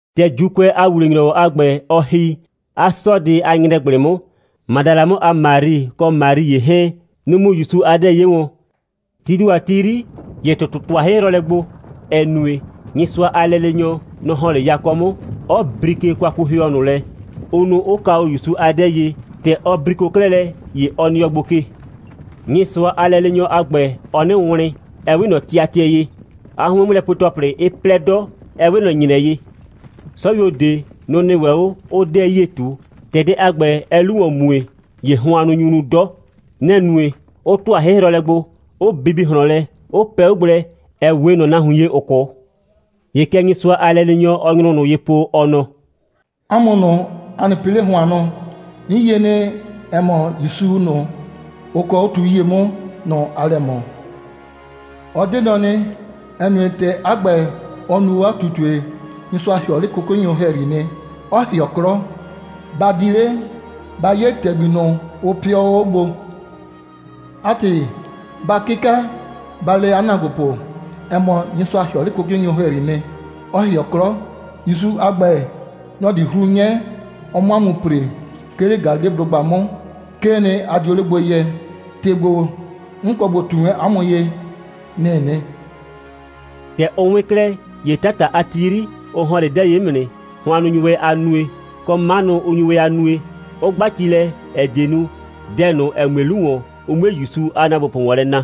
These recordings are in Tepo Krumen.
‑Tɛ ‑Juukʋɛ a ‑wuwle‑nyrɔwɔ a ‑gbɛ, ɔ ‑hi, 'a 'sɔɔdɩ a ‑nyrɛgblɩ 'mʋ, Madala 'mʋ a Mari, kɔ Mari ‑ye 'hɛɛn, nʋ‑ mu ‑Yusu a 'dɛɛ 'ye wɔn. Tii ‑do a ti 'yri, ‑ye ‑tʋtʋ ‑tʋa 'hɩhrɔlɛ gbo, ‑ɛ nue, Nyɩsʋa a lɛleenyɔ, nɔ‑ ‑hɔn 'le yakɔ 'mʋ, 'ɔ brike kwakuhɩɔ ꞊nʋ lɛ, ʋ nu, 'ʋ ka o ‑Yusu a 'dɛɛ ye. ‑Tɛ ɔ briko 'klɛɛ lɛ, ‑ye ɔ nɩɔ gbo ke. Nyɩsʋa a lɛleenyɔ a ‑gbɛ, ɔɔ 'nɩ wlɩn, 'ɛ 'we ꞊nɔ tɩatɩɛ ye, 'a 'hʋɩn'mʋlɛpue‑tɔplɩ 'ɩ 'plɛ 'dɔ, 'ɛ 'we ꞊nɔ ‑nyrɛ ye. 'Sɔyuo ꞊de, nʋ‑ nɩ ‑wɛ 'o, 'ʋʋ 'dɛɛ 'yie ꞊tu. ‑Tɛ dɛ a ‑gbɛ, ɛɛ 'lu ‑wɔn mue, ‑ye hʋannʋ nyu nu 'dɔ. Nɛ‑ nue, 'ʋ ‑tʋa 'hɩhrɔlɛ gbo, 'ʋ bibi ꞊hlɔn lɛ, 'ʋ pɛ 'o gblɛ, ‑ɛ 'we ꞊nɔ nahuin ye, ‑ʋ 'kʋ. ‑Ye kɛ Nyɩsʋa a lɛleenyɔ, ɔɔ nyrʋ ꞊nʋ ye po, ɔ nɔ: «'A mʋ ꞊nʋ, a nɩ pɩ 'le hʋannʋ! 'N yie nɩ, ‑ɛ mɔ, ‑Yusu ꞊nʋ, ʋ kɔɔ 'o tu 'yie 'mʋ, nɔ‑ aa lɛ ꞊mɔ. Ɔ 'de nɔ nɩ, ‑ɛ nue, ‑tɛ 'a ‑gbɛ, ɔ nu o 'a ꞊tutue, Nyɩsʋa ‑hɩɔ 'le 'kʋkʋnyʋ ‑hɛyri nɩ, 'ɔ ‑hɩɔ 'klɔ. Ba di 'le, ba 'ye ‑tɛgbi ꞊nʋ, ʋ pɩɔ o 'o gbo. 'A ‑tɩ, ba 'kɩka, ba le 'a ‑naagbopʋ, ‑ɛ mɔ, Nyɩsʋa ‑hɩɔ 'le 'kʋkʋnyʋ ‑hɛyri 'mʋ nɩ, 'ɔ ‑hɩɔ 'klɔ. ‑Yusu a ‑gbɛ, nɔ‑ di 'hru 'nyɛ, ɔ 'mʋ 'a mʋ ‑pre, 'ke 'le Galileblʋgba 'mʋ. 'Kee nɩ, a dio 'le gbo yɛ. ‑Tɩ ‑gbo, 'n kɔ ꞊bo ꞊tu wɛn 'a mʋ ye, nɩ‑ɩ nɩ.» ‑Tɛ ʋ 'wɩn 'klɛɛ, ‑ye 'tata a ti 'yri, ʋ ‑hɔn 'le 'dɛɛ ye 'mʋ nɩ. Hʋannʋ nyu wɛn a nue, kɔ, 'manʋ 'ʋ nyu ‑wɛ a nue, 'ʋ 'gba ci lɛ, ‑ɛ die nu, dɛ ꞊nʋ, ‑ɛ mue 'lu ‑wɔn, ʋ 'mue ‑Yusu a ‑naagbopʋ ‑wɔn lɛ na.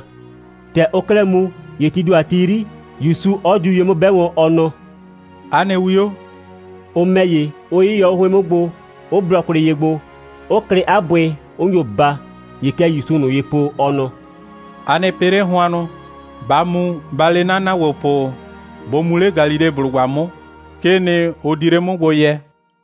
‑Tɛ ʋʋ 'klɛɛ mu, ‑ye tii ‑do a ti 'yri, ‑Yusu 'ɔ diu ye 'mʋ 'bɛ wɔn, ɔ nɔ: «'A nɩ 'wio,» ʋ ‑mɛ ‑ye, 'ʋ 'yɩyɔ 'o 'hʋɩn 'mʋ gbo, 'ʋ blɔ kwlɩ ye gbo, 'ʋ klɩ 'a bʋɩ, 'ʋ nyo baa. ‑Ye kɛ ‑Yusuu ꞊nʋ ye po, ɔ nɔ: «A nɩ pɩ 'le hʋannʋ! Ba mu, ba le 'na ‑naagbopʋ, bʋ mu 'le Galileblʋgba 'mʋ. 'Kee nɩ, ʋ di 'le 'mʋ gbo yɛ.»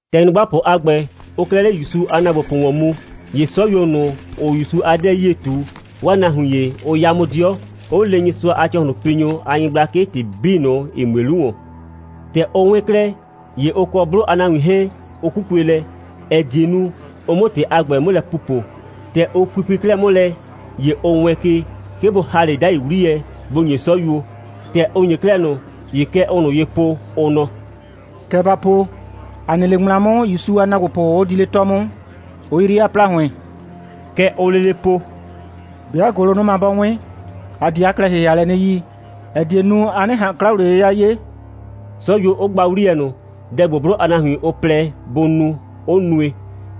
‑Tɛ nyrʋgbapʋ a ‑gbɛ, ʋʋ 'klɛɛ 'le ‑Yusu a ‑naagbopʋ ‑wɔn mu, ‑ye 'sɔyuo ꞊nʋ, ‑ʋʋ ‑Yusu a 'dɛɛ 'yie ꞊tu, 'waa nahuin ‑ye, ʋ 'ya 'mʋ 'dɩɔ, 'ʋ le Nyɩsʋa a ‑cɔhlʋnpinyʋ a nyɩgblakɩ ‑tɩ 'bii ꞊nʋ, ‑ɩ mue 'lu ‑wɔn. ‑Tɛ ʋ 'wɩn 'klɛɛ, ‑ye ʋ kɔ 'blʋ a nahuin 'hɛɛn, ʋ 'kukue lɛ, ‑ɛ die nu, ʋ 'mʋ ‑tɩ a ‑gbɛ 'mʋ lɛ pupo. ‑Tɛ ʋ pupui 'klɛɛ 'mʋ lɛ, ‑ye ʋ wɛɛn ke, 'ke bʋ ‑ha 'le 'dai 'wliyɛ, bʋ ‑nye 'sɔyuo. ‑Tɛ ʋ ‑nye 'klɛɛ ꞊nʋ, ‑ye kɛ ʋʋ ꞊nʋ ye po, ʋ nɔ: «Kɛ ba po: ‑A nɩ 'le ŋmla 'mʋ, ‑Yusu a ‑naagbopʋ 'ʋ di 'le 'tɔ 'mʋ, 'ʋ 'yri 'a ‑plahʋɩn.» Kɛ ʋʋ lele po: «'Bɩa ‑gʋlʋnʋma 'bɔ 'wɩn, ‑a di 'a klɛ‑hɩhɩalɛ 'nɩ yi, ‑ɛ die nu, a 'nɩ ꞊han 'kla‑wliye'yɩya 'ye,» 'sɔyuo 'ʋ gba 'wliyɛ ꞊nʋ, dɛ ‑gbo, 'blʋ a nahuin, ʋ plɛ bʋ nu, 'ʋ nue.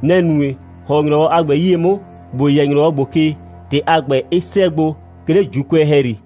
Nɛ‑ nue, ‑hɔn 'o ‑nyrɔwɔ a ‑gbɛ 'yie 'mʋ, ‑bo yɛ ‑nyrɔwɔ ‑gbo ke, ‑tɩ a ‑gbɛ 'ɩ 'sɛɛ gbo, 'ke 'le ‑Juukʋɛ ‑hɛyri.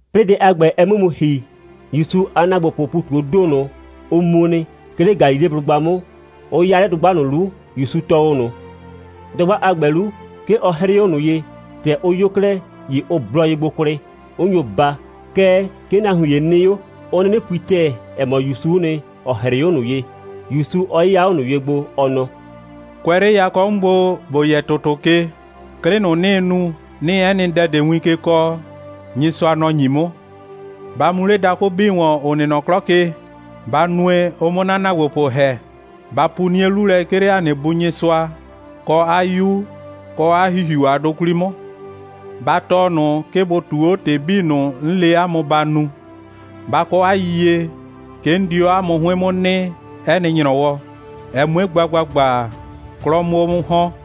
'Plɩɩ dɛ a ‑gbɛ, ɛ 'mʋ mu ‑hi, ‑Yusu a ‑naagbopʋʋ ‑pu ꞊tu 'o ‑do ꞊nʋ, ʋ mu nɩ, 'ke 'le Galileblʋgba 'mʋ, 'ʋ 'ya 'le dʋgba ꞊nʋ 'lu, ‑Yusu tɔɔ o ꞊nʋ. Dʋgba a ‑gbɛ 'lu, 'ke ɔ 'hrɩɩ 'o ꞊nʋ ye. ‑Tɛ ʋ 'yo 'klɛɛ, ‑ye ʋ blɔ ye gbo kwlɩ, 'ʋ nyo baa. Kɛɛ, 'ke nahuin ‑ye nɩ 'o, 'ʋ 'nɩnɩ pui ‑tɛɛ, ‑ɛ mɔ, ‑Yusu'u nɩ, ‑ɔ 'hrɩɩ 'o ꞊nʋ ye, ‑Yusu 'ɔ 'yɩya 'o ꞊nʋ ye gbo, ɔ nɔ: «Kʋɛ 'le yakɔ 'mʋ gbo, ‑bo yɛ ‑tʋtʋ ke, 'klɩ 'bii ꞊nʋ, 'nɩɩ nu, 'nɩɩ 'ɛ nɩ dɛ ꞊de win ke kɔɔ, Nyɩsʋa, nɔ‑ ‑nyi 'mʋ. Ba mu 'le dakʋ 'bii ‑wɔn, ‑ʋ nɩ nɔ 'klɔ ke, ba nue, ʋ 'mʋ 'na ‑naagbopʋ ‑hɛ. Ba pu 'nie 'lu lɛ, 'ke 'le ‑a nɩ Bu Nyɩsʋa, kɔ 'a 'Yu, kɔ 'a ‑Hihiu a 'dʋ 'kwli 'mʋ. Ba tɔɔ ꞊nʋ, 'ke bʋ ꞊tuu 'o ‑tɩ 'bii ꞊nʋ, 'n le 'a mʋ, ba nu. Ba kɔ 'a yiyie, 'ke 'n di 'o 'a mʋ 'hʋɩn 'mʋ nɩ, 'ɛ nɩ ‑nyrɔwɔ, ɛ 'mue gba ‑gbagba, 'klɔ 'mʋ 'o 'mʋ ‑hɔn.»